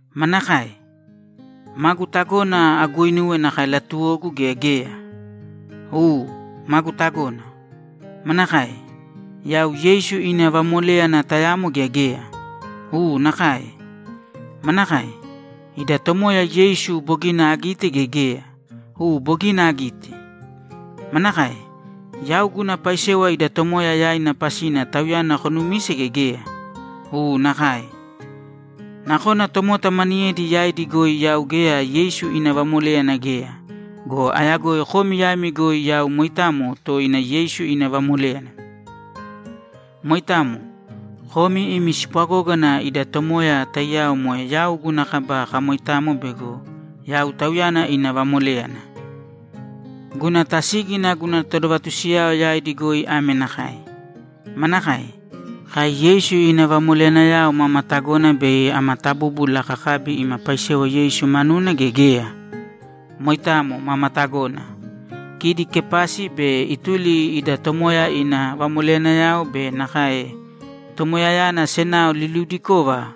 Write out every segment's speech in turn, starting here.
Manakae? Magu tagona aguuinuwe nakae latuwogu gea geya? U, magu tagona. Manakae? Yau Yeisu ina vamoléyana tayamo gea geya? U, nakae. Manakae? Ida Tomoya Yeisu bogina agite gea geya? U, bogina agite. Manakae? Yau guna paisewa ida Tomoya yaina pasina Tauyana konumise gea geya? U, nakae. Nakona tomota maniyedi yaidi goi yau geya Yeisu ina vamoléyana geya go, ayagoi komi yaimi goi yau moitamo toina Yeisu ina vamoléyana. Moitamo. Komi imi spwagógana ida Tomoya taiyao moe yau guna kaba kamoitamo bego yau Tauyana ina vamoléyana. Guna tasígina guna todovatusiyao yaidi goi ame nakae: Manakae? Kai Yeisu ina vamoleyanayao mama tagona bei ama tabúbula kakabi ima paisewa Yeisu manuna gea geya? Moitamo, mama tagona. Kidi Kepasi be ituli ida Tomoya ina vamoleyanayao be nakae Tomoyayana senao liliudikova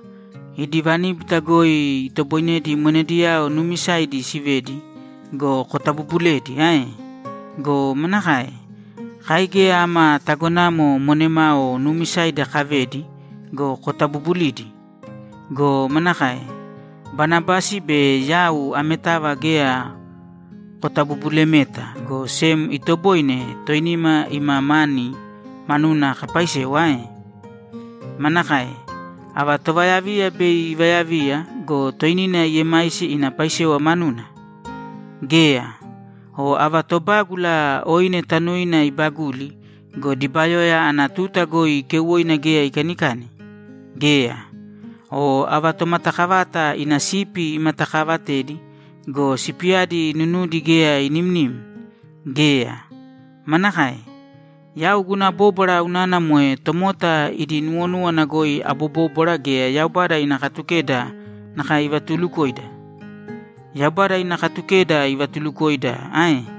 idi vaníbita goi itoboinedi monediyao nuumisaidi sivedi go, kotabubulidi ae? Go manakae? Kai geya ama tagonamo monemao nuumisaidi kavedi go, kotabubulidi? Go manakae? Banabasi be yau ametava geya kotabubulimeta, go sem itoboine toinima ima mani manuna kapaisewa ae? Manakae? Ava tovayaviya bei ivayaviya go, toinina iemaisi ina paisewa manuna? Geya! O ava tobágula oine tanuina ibaguli go, dibayoya ana tuta goi keuwoina geya ikanikani? Geya! O ava tomatakavata ina sipi imatakaavatedi go, sipiyadi nunudi geya inimnim? Geya! Manakae? Yau guna bóbwara unana moe tomota idi nuwonúwana goi abobóbwara gea Yaubada ina Katukeda nakae ivatulukoida? Yaubada ina Katukedayana ivatulukoida ae?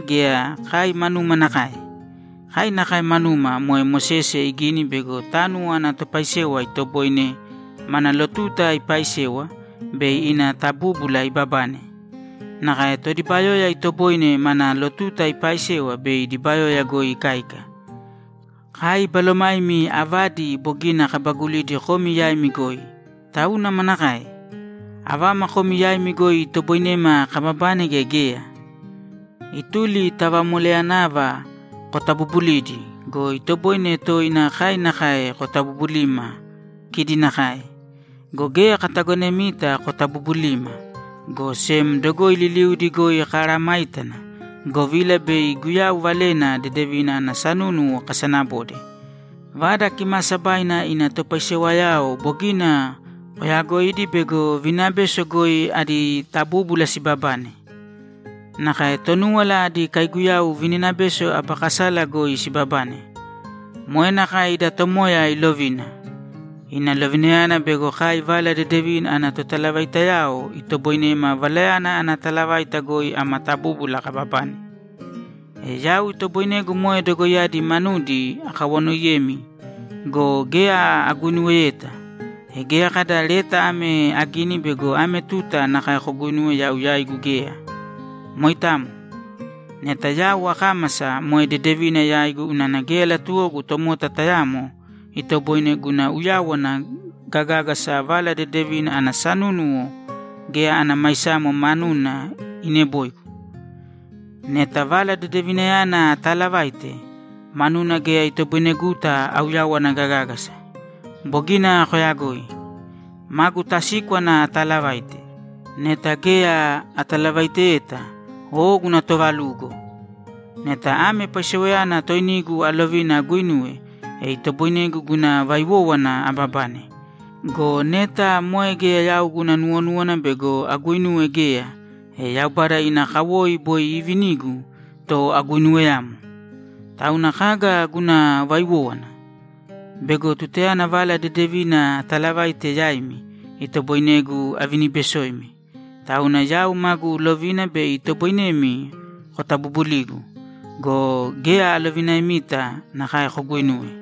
gea kai manuma nakae? Kai nakae manuma moe Mosese igini bego tánuwo ana topaisewa itoboine mana lotuta ipaaisewa bei ina tabúbula ibabane. Nakae todibayoya itoboine mana lotuta ipaaisewa bei dibayoya goi ikáika. Kai balomaimi avadi bogina kabaguli komi yaimi goi, tauna manakae? Avama komi yaimi goi itoboinema kababane gea geya? Ituli ta vamoleyanava kotabubulidi go, itoboine toina kai nakae kotabubulima kidi nakae. Go geya katagonemita kotabubulima, go sem dogoi liliudi goi kamesayágana, govila bei Guyau Valena Dedevina ana sanúnuwo kasanabode. Vada Kimaasabaina ina topaisewayao bogina koyagoidi bego vininabeso goi adi tabúbula sibabane. Nakae Tonúwala adi kaiguyau vininabeso aba kasala goi sibabane. Moe nakae ida Tomoya ilovina. Ina lovinayana bego kai Vala Dedevina ana totalavaitayao itoboinema Valayana ana talavaita goi ama tabúbula kababane. E yau itoboinegu moe dogoiyadi manudi akawanoiyemi go, geya aguinuweyeta. E geya kada leta ame agini bego ame tuta nakae koguinuwe yau yaigu geya. Moitamo. Neta yau akámasa, moe dedevina yaigu unana geya latuwogu tomota tayamo itoboine guna uyawana gagágasa Vala Dedevina ana sanúnuwo geya ana maisamo manuna ineboigu. Neta Vala Dedevinayana ataalavaite, manuna geya itoboineguta auyawana gagágasa. Bogina koyagoi. Magu tasíkwana ataalavaite. Neta geya atalavaiteyeta, o guna toovalugo! Neta ame paisewayana toinigu alovina aguinuwe, e itoboinegu guna vaiwówana ababane. Go neta moe geya yau guna nuwonúwana bego aguinuwe geya, e Yaubada ina kawoi boi iivinigu to aguinuweyamo. Tauna kaga guna vaiwówana? Bego tutayana Vala Dedevina atalavaite yaimi, itoboinegu avinibesoimi. Tauna yau magu lovina bei itoboinemi kotabubuligu go, geya alovinaemita nakae koguinuwe.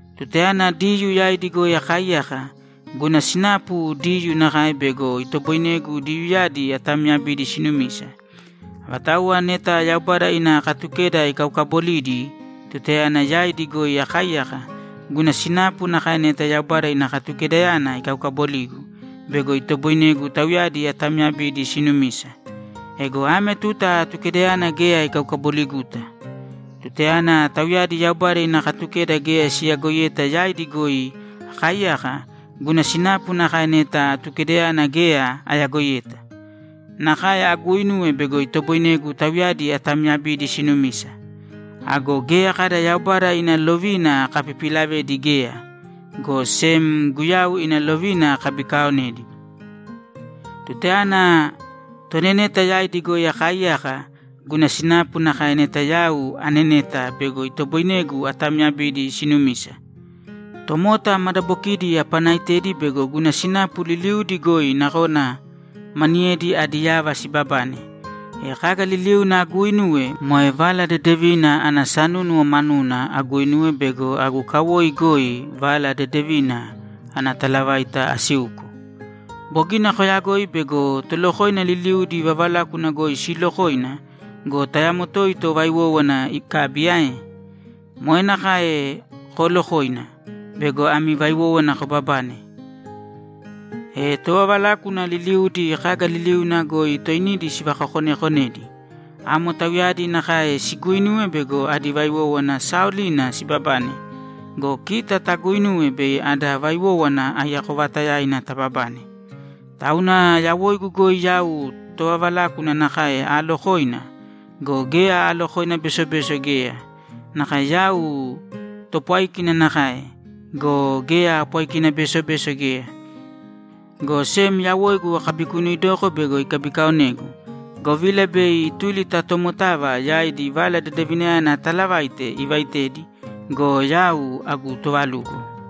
Tutayana Diyuu yaidi goi akaaiyaka, guna sinapu Diyuu nakae bego itoboinegu Diyuuyadi atamyabidi sinumisa. Avatauwa neta Yaubada ina Katukeda ikaukabolidi tutayana yaidi goi akaaiyaka, guna sinapu nakae neta Yaubada ina Katukedayana ikaukaboligu bego itoboinegu tauyadi atamyabidi sinumisa. Ego ame tuta Atukedayana geya ikaukaboliguta. Tutayana tauyadi Yaubada ina Katukeda geya siyagoiyeta yaidi goi akaaiyaka, guna sinapu nakae neta Atukedayana geya ayagoiyeta. Nakae aguuinuwe bego itoboinegu tauyadi atamyabidi sinumisa. Ago geya kada Yaubada ina lovina akapipilavedi geya, go sem Guyau ina lovina akabikaaonedi. Tutayana toneneta yaidi goi akaaiyaka, guna sinapu nakae neta yau aneneta bego itoboinegu atamyabidi sinumisa. Tomota madabokidi apanaitedi bego guna sinapu liliudi goi nakona maniyedi adi yava sibabane. E kaga liliuna aguuinuwe, moe Vala Dedevina ana sanúnuwo manuna aguinuwe bego agu kawoi goi Vala Dedevina ana talavaita asiuko. Bogina koyagoi bego tolokoina liliudi vavalákuna goi siilokoina go, tayamo toito vaiwówana ikabi ae? Moe nakae koolokōina bego ami vaiwówana kobabane. E tovavalákuna liliudi kaga liliuna goi toinidi sivakakonekonedi. Amo tauyadi nakae siguuinuwe bego adi vaiwówana saaolina sibabane go, kita taguuinuwe bei ada vaiwówana aiyako vaatayaina tababane. Tauna yawoigu goi yau tovavalákuna nakae aalokoina go, geya aalokoina besobeso geya. Nakae yau topwáikina nakae go, geya aapwáikina besobeso geya, go sem yawoigu akabikunuuidoko bego ikabikaonegu, govila bei ituli ta tomotava yaidi Vala Dedevinayana ataalavaite ivaitedi go, yau agu tovalugo.